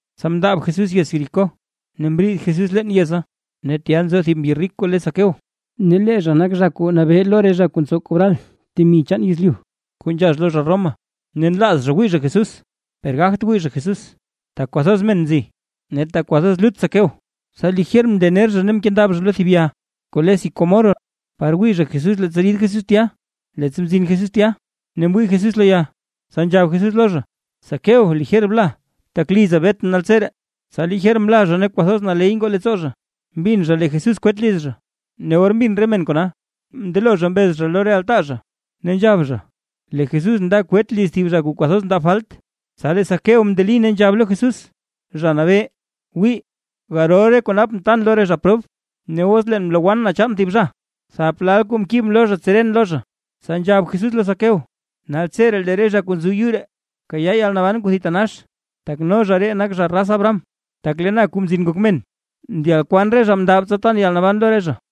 Tsa mndaab Jesús yez Jericó ne mriid Jesús leen yeza. Ne tya nzo thib mbyi rik kuu le Zaqueo, ne lee zha nak zha kuu nabee lo re zha kuu ntsow kobral temi chaan yezlyu kuu nzhax lo zha Roma. Ne nlaaz zha wii zha Jesús, per gagt wii zha Jesús, tak kwathoz men nzi, ne tak kwathoz lut Zaqueo. Tsa lijer mndener zha ne mkendab zha lo thib ya kuu le sicómoro, par wii zha Jesús leettsa rid Jesús tya. Leettsa mzin Jesús tya, ne mwii Jesús lo ya, tsa nzhab Jesús lo zha: ―Zaqueo, lijer bla, tak liza betʼn naltseree. Tsa lijer mla zha ne kwathoz naley ngoo leettsoo zha, mbin zha lee Jesús kwet liz zha. Ne or mbin re men kona, mndelo zha mbez zha lo re altaa zha, ne nzhab zha; lee Jesús nda kwet liz thib zha kuu kwathoz ndab falt. Tsa lee Zaqueo mndeli ne nzhab lo Jesús: ―Zha Nabee, wii, garol re kuu napʼn tan lo re zha prob; ne os leen mlowann na chaan thib zha, thap lal kuu mkibʼn lo zha tseren lo zha. Tsa nzhab Jesús lo Zaqueo: ―Naltseree lee re zha kuu nzo yuu ree mkayaa yalnaban kuu thitanax, tak no zha ree nak zha raz Abraham. Tak lee na, Kuu Mzin Ngok Men, ndyaad kwaan re zha kuu mndab, tsa tan yalnaban lo re zha.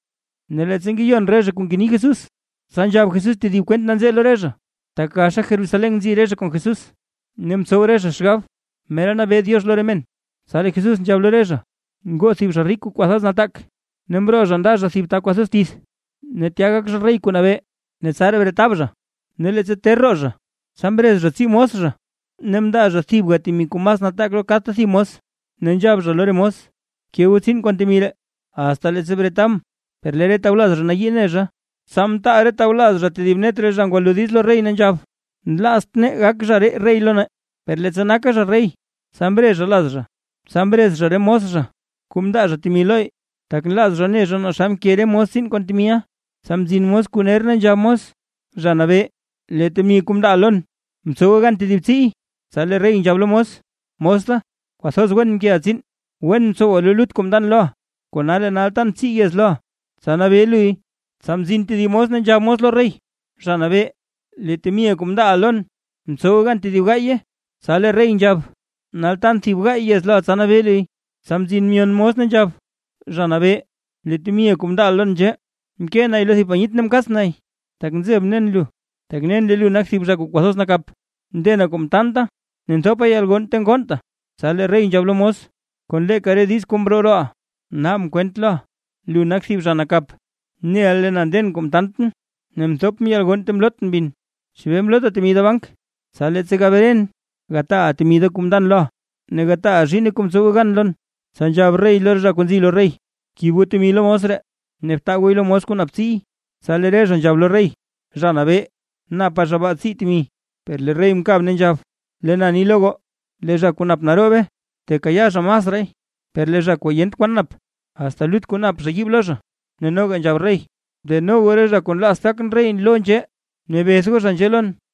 Ne leettsa ngeyon re zha re kuu ngeni Jesús, tsa nzhab Jesús tedib kwent nanzee lo re zha, tak gaxa Jerusalén nzi re zha kon Jesús, ne mtsow re zha xgab, mera nabee Diox lo re men. Tsa lee Jesús nzhab lo re zha: ―Ngoo thib zha rik kuu kwathoz nataak, ne mroo zha nda zha thib ta kwathoz tith, ne tya gak zha rey kuu nabee, ne tsaraa bretab zha. Ne leettsa ter roo zha, tsa mrez zha tsii mos zha, ne mndaa zha thibga temi kuu mas nataak lo kadta thib mos, ne nzhab zha lo re mos: “Bke goo tsiin kon temi ree, asta leettsa bretabʼn”. Per lee re tawlaz zha nayii ne zha, tsa mtaal re tawlaz zha thib net zha ngwalo diiz lo rey ne nzhab: “Nlaazt nee gak zha ree rey lo nee”. ’Per leettsa naka zha rey, tsa mre zha laz zha. Tsa mrez zha re mos zha kuu mndaa zha temi lo, tak nlaaz zha ne zha naa xa mke re mos tsiin kon temiʼa. Tsa mzin mos kuu ner ne nzhab mos: “Zha Nabee, lee temi kuu mndaaʼa lon, mtsowe gan tedib tsiiy”. Tsa lee rey nzhab lo mos: “Mos da, kwathoz wen mkeʼa tsiin. Wen mtsowa lo lut kwaa mndan loʼa, kona lee nal tan tsii yez loʼa, tsa nabee luy.” Tsa mzin tedib mos ne nzhab lo rey: “Zha Nabee, lee temiʼa kuu mndaaʼa lon mtsowe gan tedib gaaye”. Tsa lee rey nzhab: “Nal tan thib gaay yez loʼa tsa nabee luy”. Tsa mzin myon mos ne nzhab: “Zha Nabee, lee temiʼa kuu mndaaʼa lon nzhee. Mkee nay lo thib panyit ne mkaats nay, tak nzebʼn nen lu, tak nen lee lu nak thib zha kuu kwathoz nakap, ndena kuu mtaanta ne nthopa yalgonn ta ngonnta.” Tsa lee rey nzhab lo mos: “Kon leeka re diiz kuu mroo rooʼa, naabʼn kwent loʼa; lu nak thib zha nakap. Neʼa lee na nden na kuu mtaantʼn ne nthopʼn yalgonn ta mlootʼn bin. ¿Chebee mlota temi da bank? Tsa leettsa gabren, gataaʼa temi da kuu mndan loʼa, ne gataaʼa zhiinne kuu mtsowe gan lon.” Tsa nzhab rey lo re zha kuu nzi lo rey: “Bkib goo temi lo mos ree, ne btaa gooy lo mos kuu nap tsiiy”. Tsa lee re zha nzhab lo rey: “Zha Nabee napa zha baa tsii temi”. Per lee rey mkab ne nzhab: “Lee na ni lo goo: Lee zha kuu nap naroobe tekayaa zha masraay, per lee zha kuu yent kwan nap, asta lut kuu nap zha yiib lo zha. Ne noga nzhab rey: Deno goo re zha kuu nlaazt gakʼn rey lo nzhee, ne beth goo zha nzhee lon.”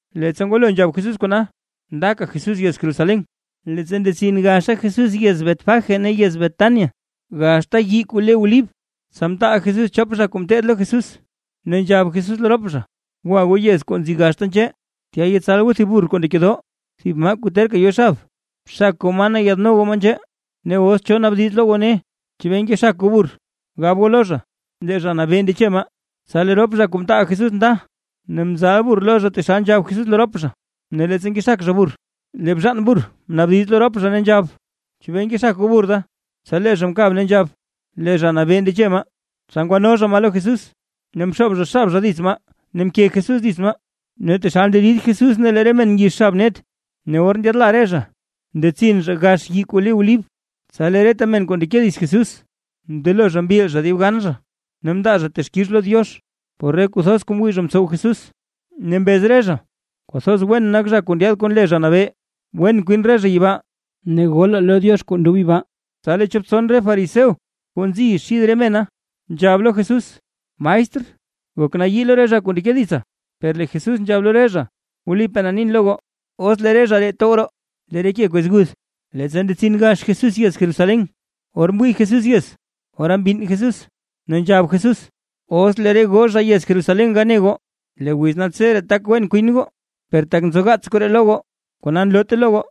Leettsa ngwalo nzhab Jesús kona, ndaka Jesús yez Jerusalén. Leettsa ndetsin gaxa Jesús yez Betfagé ne yez Betania, gaxta yii kuu le Olib, tsa mtaal Jesús chop zha kuu ngeteed lo Jesús, ne nzhab Jesús lo rop zha: ―Gwa goo yez kuu nzi gaxta nzhee, tya yetsal goo thib burr kuu ndekedoo, thib maa kuu terka yo xab. Xak goo maa ne yaadno goo maa nzhee. Ne os cho zha naabdiz lo goo ne: “¿Chebee ngexak goo burr?” Gab goo lo zha: “Lee Zha Nabee ndeche maa”. Tsa lee rop zha kuu mtaal Jesús nda, ne mzal burr lo zha taxal nzhab Jesús lo rop zha. Ne leettsa ngexak zha burr, lee bzhaan burr, mnaabdiz lo rop zha ne nzhab: ―¿Chebee ngexak goo burr da? Tsa lee zha mkab ne nzhab: ―Lee Zha Nabee ndeche maa. Tsa ngwano zha maa lo Jesús. Ne mxoob zha xab zha dits maa ne mke Jesús dits maa. Ne taxal nderid Jesús lee re men ngix xab net. Ne or ndyaadla re zha ndetsin zha gax yii kuu le Olib, tsa lee reta men kuu ndeke dits Jesús mndelo zha mbil zha dibgan zha ne mndaa zha texkix lo Diox, por re kuu thoz kuu mwii zha mtsow Jesús. Ne mbez re zha: ―¡Kwathoz wen nak zha kuu ndyaad kon le Zha Nabee! ¡Wen kwin re zha yibaa ne golaa lo Diox kuu ndob yibaa! Tsa lee chop tson re fariseo kuu nzi xid re mena, nzhab lo Jesús: ―Maestr, gok nayii lo re zha kuu ndeke ditsa. Per lee Jesús nzhab lo re zha: ―Wlipaa na nin lo goo, os lee re zha ree tow roo, lee re ke kwez guth. Leettsa ndetsin gax Jesús yez Jerusalén, or mwii Jesús yez, ora mbinn Jesús, ne nzhab Jesús: ―¡Os lee re goo zha yez Jerusalén gane goo, lee wiz naltseree tak wen kwin goo, per tak nzogaats koree lo goo, kona nloote lo goo!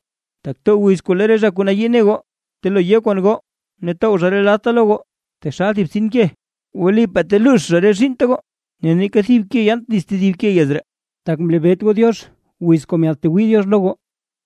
Tak too wiz kuu lee re zha kuu nayii ne goo telo yo kon goo, ne tow zha re ladta lo goo, taxal thib btsin ke. Wlipaa teluux zha re zhiinnta goo, ne neeka thib ke yaant dits tedib ke yez ree, tak mlebeet goo Diox wiz kuu myaadtwii Diox lo goo.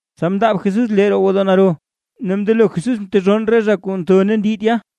Tsa mndaab Jesús lee roo gwodoo naro, ne mndelo Jesús mtezhonn re zha kuu ntho ne ndi tya.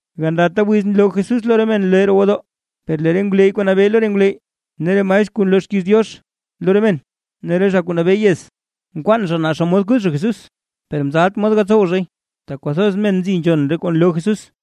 Gandata wiz nloo Jesús lo re men lee roo gwodoo, per lee re ngwleyy kuu nabee lo re ngwleyy, ne re maestr kuu nloo xkiiz Diox lo re men, ne re zha kuu nabee yez, nkwaan zha naa xomod kuth zha Jesús. Per mzalt zha mod gatsow zhay, tak kwathoz men nzi nzhon re kuu nloo Jesús.